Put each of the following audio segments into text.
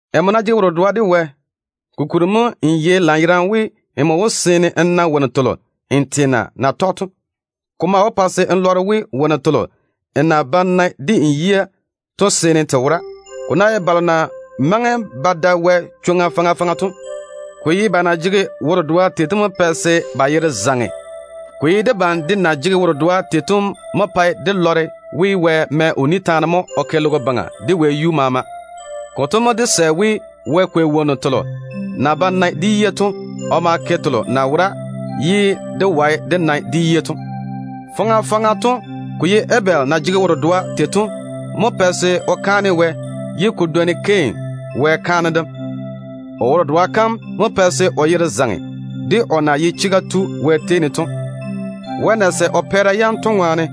Nmo ná jege wo-dedoa de Wɛ, kokuri mo n yei lanyerane we, nmo wó seene n na wonnu telo n teena na tɔge to. Ko maa wó pa se n lɔre we, wonnu telo n na ba nae de n yia to seene te wora. Ko ná ye balo na maŋe ba da Wɛ chwoŋa faŋa faŋa to, ko ye ba na jege wo-dedoa tei to mo pɛ se ba yere zaŋe. Ko ye debam de na jege wo-dedoa tei to mo pae dé lɔre we, Wɛ mɛ o ni taane mo o ke logo baŋa de wɛyuu maama. Konto mo dé sɛ we Wɛ kwei wonnu telo na ba nae de yia to o ma ke telo na wora ye dé wae dé nae de yia to. Faŋa faŋa to ko ye Abel na jege wo-dedoa tei to mo pɛ se o na kwei kolo o ma kaane Wɛ to dwoni Kain na kaane Wɛ tei to. O wo-dedoa kam mo pɛ se o yere zaŋe de o na ye chega tu Wɛ tei ne to, o pɛɛra yam na su Wɛ yi to ŋwaane.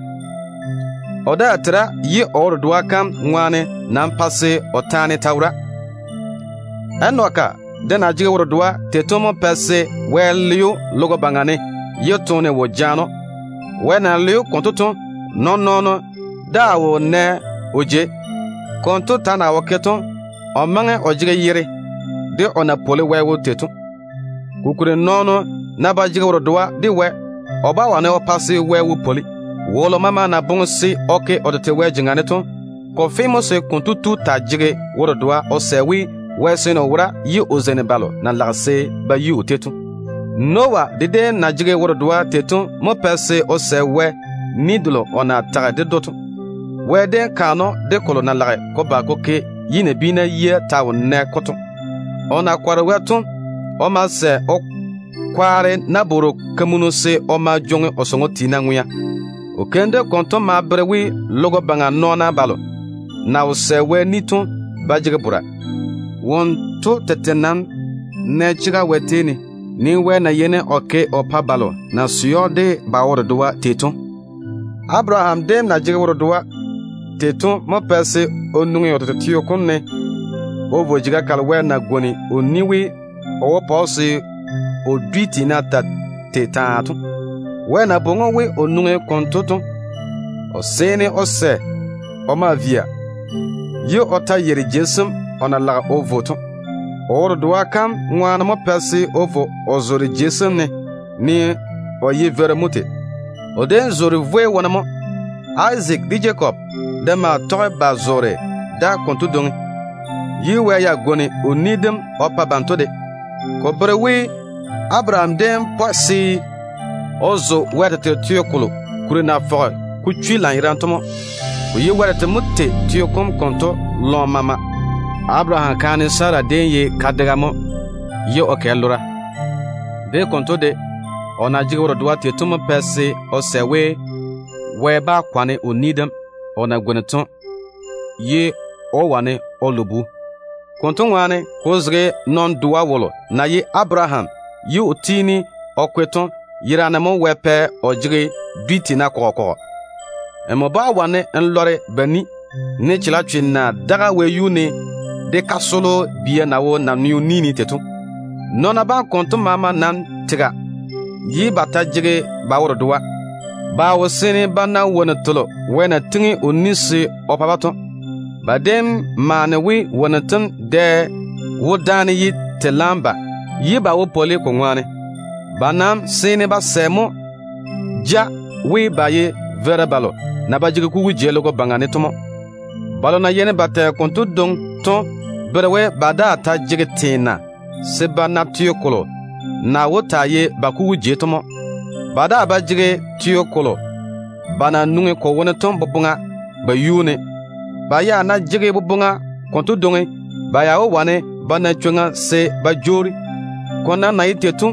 O daa tera, ye o wo-dedoa kam ŋwaane nam pae se o taane ta wora. Enoki de na jege wo-dedoa tei to mo pɛ se Wɛ le‑o logo baŋa ne ye toone wo jaane‑o. Wɛ na le‑o konto to, nɔɔn-nɔɔno daa wo nɛ o jei. Konto ta na wo ke to, o maŋe o jege yere de o na pwoli Wɛ wo tei to. Kokuri nɔɔno ná ba jege wo-dedoa de Wɛ, o bá wane o pa se Wɛ wo pwoli. Wolo maama na boŋe se o ke o tete Wɛ jeŋa ne to, ko fe mo se konto tu taa jege wo-dedoa o sɛ we, Wɛ seene o wora ye o zeini balo na lage se ba lɔre‑o to. Noah de déem na jege wo-dedoa tei to mo pɛ se o sɛ Wɛ ni delo o na tage ded‑o to. Wɛ déem kaane‑o de kolo na lage ko ba ko ke ye nabiina yia ta wo nɛ-ko to. O na kɔre Wɛ to, o ma sɛ o kwaare nabwor-kamunu se o ma jwoŋi o sɔŋɔ tiina ŋwea. O keim dem konto ma bere we, nabiina balo na wo sɛ Wɛ ni to ba jege bora. Wonto tete nam nɛ chega Wɛ tei ne, ne Wɛ na yeini o ke o pa balo na sɛ‑o de ba wo-dedoa to tei. Abaraham déem na jege wo-dedoa tei to mo pɛ se o nwoŋi o tete teo kom ne o vo jeiga kalo Wɛ na pwooli we, o wó pa‑o se o dwi tiina taa tei taa to. Wɛ na bwoŋi‑o we o nwoŋi konto to, o ma seene o sɛ se o vo, ye o ta yeiri jei sem o na lage o vo to. O wo-dedoa kam ŋwaane mo pɛ se o vo o zoore jei sem konto ne, ne o ye veiru mo tei. O déem zoore vwei wone mo. Izaak de Jakob de maa tɔge ba zoore da konto dwoŋi, ye Wɛ ya pwooli kampwola o pa banto de. Ko bere we, Abaraham déem pɔe se o zo Wɛ tete teo kolo kuri na fɔge ko chwi lanyerane to mo. Ko ye Wɛ tete mo tei teo kom konto lɔɔm maama. Abaraham kaane Sara déem ye kadega mo ye o kɛ lora. De konto de, o na jege wo-dedoa tei to mo pɛ se o sɛ we, Wɛ bá kwane o ni dem o na tiŋi to ye o wane o lo bu. Konto ŋwaane, ko zege nɔn-doa wolo na ye Abaraham ye o tiini o kwe to yera ne mo Wɛ pɛ o jege dwi kɔgɔ kɔgɔ. Nmo bá‑n wane n lɔre ba ni, ne chalechwe na daga wɛyuu ne de kasolo bia na wo naneo ni ne tei to. Nɔɔna bam konto maama nam tega, ye ba ta jege ba wo-dedoa. Ba nam wo nɛ wonnu telo Wɛ na pwooli se o pa-ba to. Ba déem maane we, wonnu tem dɛ wó dáane ye te laam ba, ye ba wo pwoli ko ŋwaane. Ba nam seene ba sɛ mo ja we, ba ye veira balo na ba jege kugu jei logo baŋa ne to mo. Balo na yeini ba tɛ konto dwoŋi to bere we, ba daa ta jege teena se ba na teo kolo na wó taa ye ba kugu jei to mo. Ba daa ba jege teo kolo ba na nwoŋi ko wone to boboŋa ba yuu ne. Ba ya ná jege boboŋa konto dwoŋi, ba ya wó wane ba na chwoŋa se ba jwoori. Ko nam na ye tei to,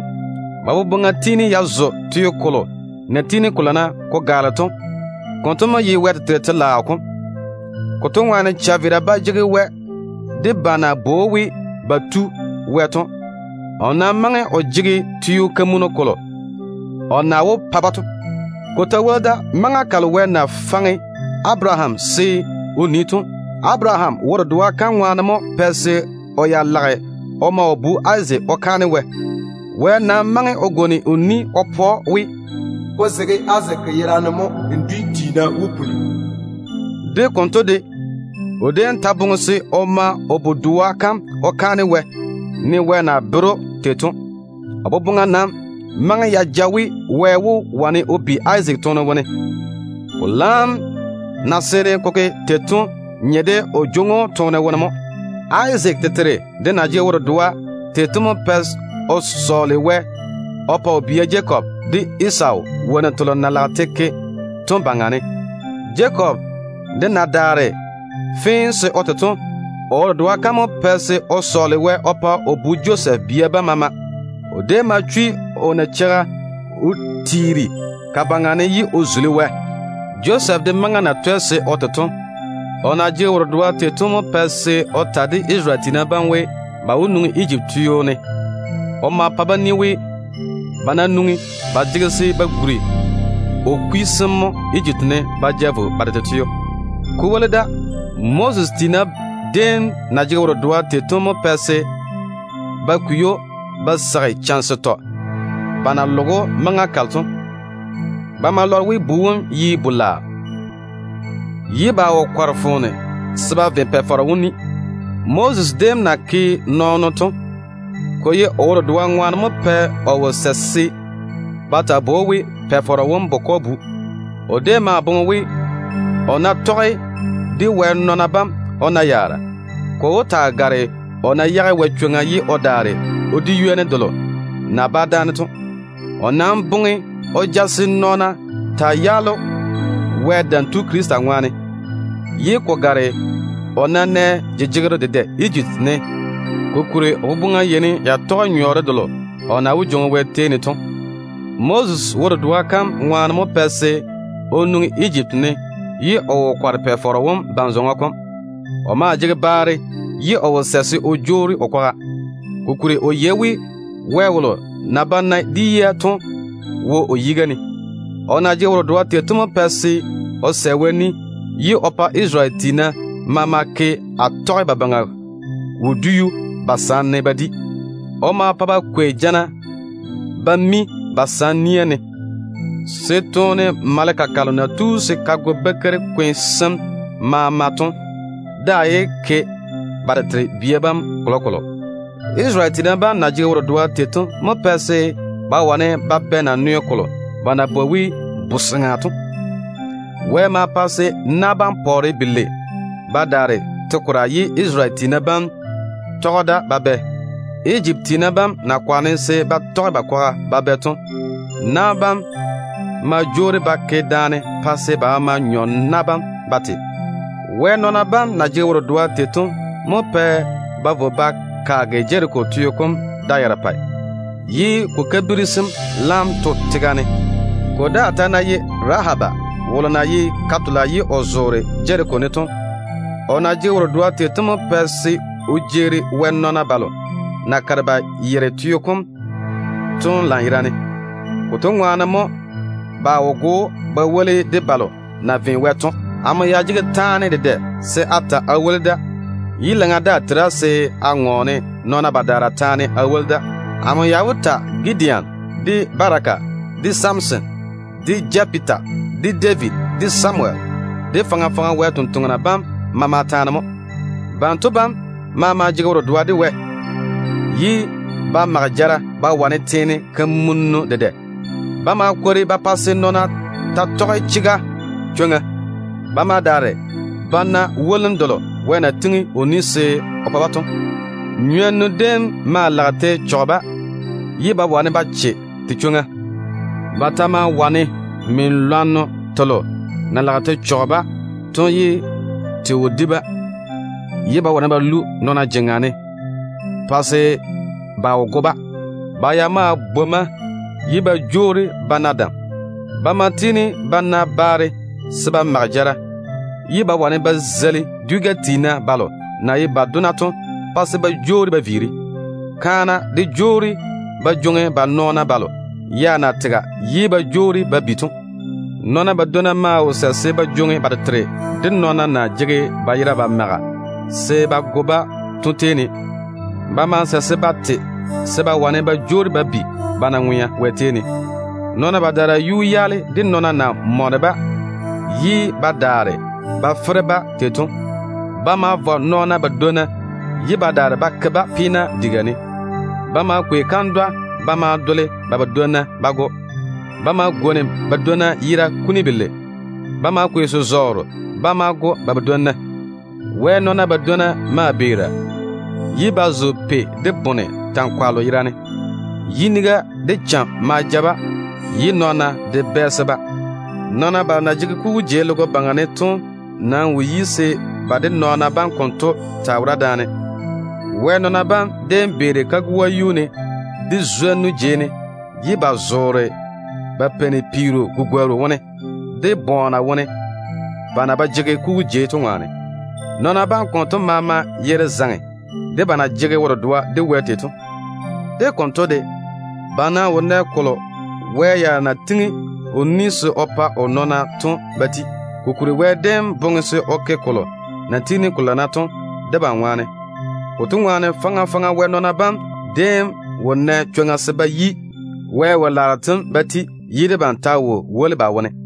ba boboŋa tiini ya zo teo kolo na tiini ko lana ko gaale to. Konto mo ye Wɛ tete telaao kom. Konto ŋwaane, chaveera ba jege Wɛ de ba na bwoi‑o we ba Wɛ to. O nam maŋe o jege teo kolo o na wó pa-ba to. Ko ta woli da, maŋa kalo Wɛ na faŋe Abaraham se o nii to, Abaraham wo-dedoa kam ŋwaane mo pɛ se o ya lage o ma o bu Izaak o kaane Wɛ. Wɛ nam maŋe o pwooli ded‑o we, “Ko zege Izaak yera ne mo n dwi tiina wó puli.” De konto de, Abaraham déem ta boŋe se o ma o bu-doa kam o kaane Wɛ, ne Wɛ na bere‑o tei to. O boboŋa nam maŋe ya ja we, Wɛ wó wane o bi Izaak toone wone. Ko laam na seene ko ke tei to nye de o jwoŋi‑o toone wone mo. Izaak tete de na jege wo-dedoa tei to mo pɛ o sɔɔle Wɛ swolim o yage o bia Jakob de Esawu yuu ne se ko vo wonnu telo na lage te ke to seeni. Jakob de na daare fee se o te to, o wo-dedoa kam mo pɛ se o sɔɔle Wɛ swolim o yage o bu Josɛf bia bam maama yuu ne. O déem ma chwi o nacheiga o tiiri ka baŋa ne ye o zuli Wɛ. Josɛf de maŋa na twɛ se o te to, o na jege wo-dedoa tei to mo pɛ se o ta de Isarele tiina bam we, ba wó nwoŋi Ejipti teo ne. O ma pa-ba ni we, ba ná nwoŋi, ba jege se ba guri o kwi sem mo Ejipti ne ba ja vo ba tete teo. Ko woli da, Moses tiina déem na jege wo-dedoa tei to mo pɛ se ba kwei‑o ba seigi chane setɔ ba na loge‑o maŋa kalo to. Ba ma lɔre we, bu wom ye bu-laao, ye ba wo kɔre foone se ba ve Pa-faro wom ni dem. Moses déem na ke nɔɔno to, ko ye o wo-dedoa ŋwaane mo pɛ o wo sɛ se ba taa bwoi‑o we, Pa-faro wom bukɔ bu. O déem maa boŋe we, o ná tɔge de Wɛ nɔɔna bam o na yaara, ko wó taa gare o ná yage Wɛ chwoŋa ye o daare o di ywoni delo na bá dáane to. O nam boŋe o ja se nɔɔna taa yaale‑o Wɛ Dam Tu Krista ŋwaane, ye ko gare o ná nɛ jejegero dedɛ Ejipti ne, kokuri o boboŋa yeini ya tɔge nyɔɔre delo o na wó jwoŋi Wɛ tei ne to mo. Moses wo-dedoa kam ŋwaane mo pɛ se o nwoŋi Ejipti ne, ye o wo kɔre Pa-faro wom ban-zɔŋɔ kom. O maa jege baare, ye o wo sɛ se o jwoori o kwaga, kokuri o yei we, Wɛ wolo na ba nae de yia to wo o yiga ne. O na jege wo-dedoa tei to mo pɛ se o sɛ Wɛ ni, ye o pa Isarele tiina bam maama ke Atɔgebabaŋa wodiu ba sam ne ba di. O ma pa ba kwei jana ba ma mi ba sam nia ne, se toone maleka kalo na tu se ka go bakeiri-kwe sem maama to daa yé ke ba tete bia bam kolokolo. Isarele tiina bam na jege wo-dedoa tei to mo pɛ se ba wane ba bɛ Nane-soŋo kom. Wɛ ma pa se na bam pɔɔre belei ba daare te-kora ye Isarele tiina bam tɔge da ba bɛ. Ejipti tiina bam na kwaane se ba tɔge ba kwaga ba bɛ to, na bam ma jwoori ba ke daane pa se ba maama nyɔ na bam ba te. Wɛ nɔɔna bam na jege wo-dedoa tei to mo pɛ ba vo ba kaage Jeriko teo kom da yarepɛ, ye ko kabiri sem laam to tega ne. Ko daa ta ná ye Rahaba wolo na ye ka-tola ye o zoore Jeriko ne to, o na jege wo-dedoa tei to mo pɛ se o jeeri Wɛ nɔɔna balo na kare ba yere teo kom to lanyerane. Konto ŋwaane mo ba wo go‑o ba woli de balo na ve Wɛ to. Amo ya jege taane dedɛ se a ta a woli da, ye laŋa daa tera se a ŋɔɔne nɔɔna badaara taane a woli da. Amo ya wó ta Gideon, de Baraka, de Samson, de Jefeta, de David, de Samuwel, de faŋa faŋa Wɛ sampwori sem maama taane mo. Banto bam maama jege wo-dedoa de Wɛ, ye ba mage jara ba wane teene kamunnu dedɛ. Ba ma kwori ba pa se nɔɔna taa tɔge chega chwoŋa. Ba ma daare ba na wolim delo Wɛ na pwooli se o pa-ba to. Nywonnu déem ma lage te chɔge-ba, ye ba wane ba che te chwoŋa. Ba ta ma wane min-lwanno telo na lage te chɔge-ba to ye te wo di-ba. Ba ma wane ba lu nɔɔna jeŋa ne pa se ba wo go-ba. Ba ya maa bwomma ye ba jwoori ba na dam. Ba ma tiini ba na baare se ba mage jara, ye ba wane ba zeili dwi-gɛ tiina balo na ye ba dona to pa se ba jwoori ba viiri. Kaana de jwoori ba jwoŋi ba nɔɔna balo ya na tega ye ba jwoori ba bi to. Nɔɔna badwonna maa wo sɛ se ba jwoŋi ba tete balo na jege ba yera ba maga se ba go-ba to tei ne. Ba ma sɛ se ba te se ba wane ba jwoori ba bi ba na ŋwea Wɛ tei ne. Nɔɔna badaara yuu yaale de nɔɔna na mɔne-ba, ye ba daare ba fere-ba tei to. Ba ma vɔ nɔɔna badwonna, ye ba daare ba ke-ba peena diga ne. Ba ma kwei kandwa ba ma dole ba badwonna ba go. Ba ma gwoni badwonna yera yam kuni belei. Ba ma kwei se-zɔɔro ba ma go ba badwonna. Wɛ nɔɔna badwonna maa kare ba beera, ye ba zo pei de bone tankwallo yerane. Yiniga de cham ma ja-ba, ye nɔɔna de bɛɛse-ba. Nɔɔna balo na jege kugu jei logo baŋa ne to nam wo yi se ba de nɔɔna bam konto taa wora daane. Wɛ nɔɔna bam déem beeri kagoa yuu ne, de zwonnu jei ne. Ba maa zoore peero gugworru wone, de bɔɔna wone, ba na ba jege kugu jei to ŋwaane. Nɔɔna bam konto maama yere zaŋe de ba na jege wo-dedoa de Wɛ tei to. De konto de, ba nam wo nɛ kolo Wɛ ya na pwooli se o pa o nɔɔna to ba ti. Kokuri Wɛ boboŋa déem jaane se o ke kolo na tiini ko lana to debam ŋwaane. Konto ŋwaane, faŋa faŋa Wɛ nɔɔna bam déem wo nɛ chwoŋa se ba yi Wɛ wo-laaro tem ba ti ye debam ta wo woli ba wone.